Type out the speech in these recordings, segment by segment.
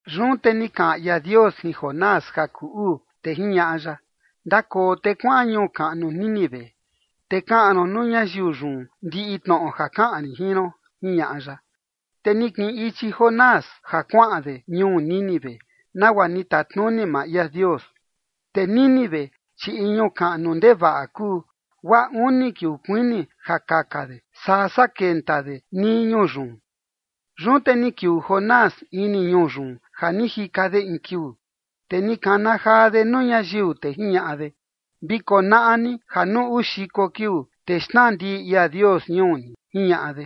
Yun te ni kaꞌan ia Dios jin Jonás ja kuu uu, te jiñaꞌa ya: ―Ndakoo te kuaꞌan ñuu kaꞌnu Nínive, te kaꞌan ron nuu ñayiu yun ndiꞌi tnoꞌo ja kaꞌan rin jin ron ―jiñaꞌa ya. Te ni kiꞌin ichi Jonás ja kuaꞌan de ñuu Nínive, nagua ni tatnuni maa ia Dios. Te Nínive, chi in ñuu kaꞌnu ndevaꞌa kuu, guaa uni kiuu kuini ja kaka de sasaa kenta de nii ñuu yun. Yun te ni kiuu Jonás ini ñuu yun ja ni jika de in kiuu, te ni kana jaa de nuu ñayiu, te jiñaꞌa de: ―Vi konaꞌa ni ja nuu uu xiko kiuu, te xnaa ndiꞌi ia Dios ñuu ni ―jiñaꞌa de.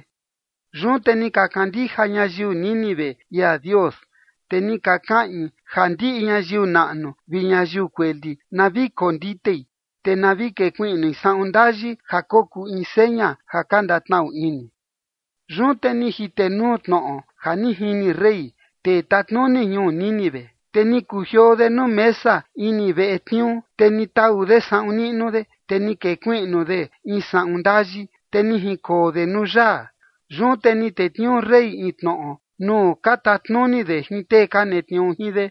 Yun te ni ka kandija ñayiu Nínive ia Dios, te ni ka kaꞌin ja ndiꞌi ñayiu naꞌnu vi ñayiu kueli na vi konditei, te na vi kekuiꞌnui saꞌun ndayi ja kokuu in seña ja ka ndatnaꞌu ini. Yun te ni jitenuu tnoꞌo ja ni jini rey, tee tatnuni ñuu Nínive, te ni kujioo de nuu mesa ini veꞌe tniuu, te ni tau de saꞌun niꞌnu de, te ni kekuiꞌnu de in saꞌun ndayi, te ni jinkoo de nuu yaa. Yun te ni tetniuu rey in tnoꞌo nuu ka tatnuni de jin tee ka netniuu jin de,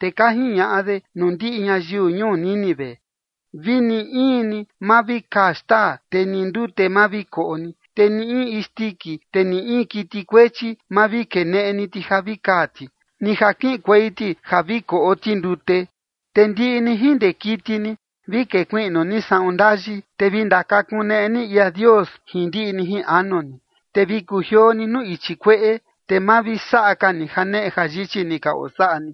te ka jiñaꞌa de nuu ndiꞌi ñayiu ñuu Nínive: “Vini in ni ma vi kaa xtaa, te ni ndute ma vi koꞌo ni, te ni in isndiki, te ni in kiti kuechi, ma vi keneꞌe ni ti ja vi kaa ti, ni ja kiꞌinkuei ti ja vi koꞌo ti ndute. Te ndiꞌi ni jin ndee kiti ni vi kekuiꞌnu ni saꞌun ndayi, te vi ndakakuneꞌe ni ia Dios jin ndiꞌi ni jin anu ni. Te vi kujioo ni nuu ichi kueꞌe, te ma vi saꞌa ka ni janeꞌe jayichi ni ka osaꞌa ni.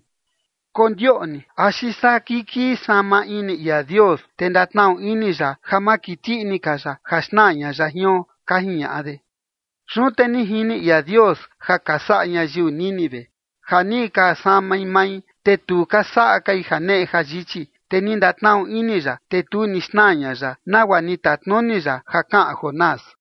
Kondioꞌni axi saa kikii sama ini ia Dios, te ndatnaꞌu ini ya ja ma kiti ini ka ya ja xnaa ña ya jion”, ka jiñaꞌa de. Yun te ni jini ia Dios ja ka saꞌa ñayiu Nínive, ja ni ka samai mai, te tu ka saꞌa kai janeꞌe jayichi. Te ni ndatnaꞌnu ini ya, te tu ni xnaa ña ya, nagua ni tatnuni ya ja kaꞌan Jonás.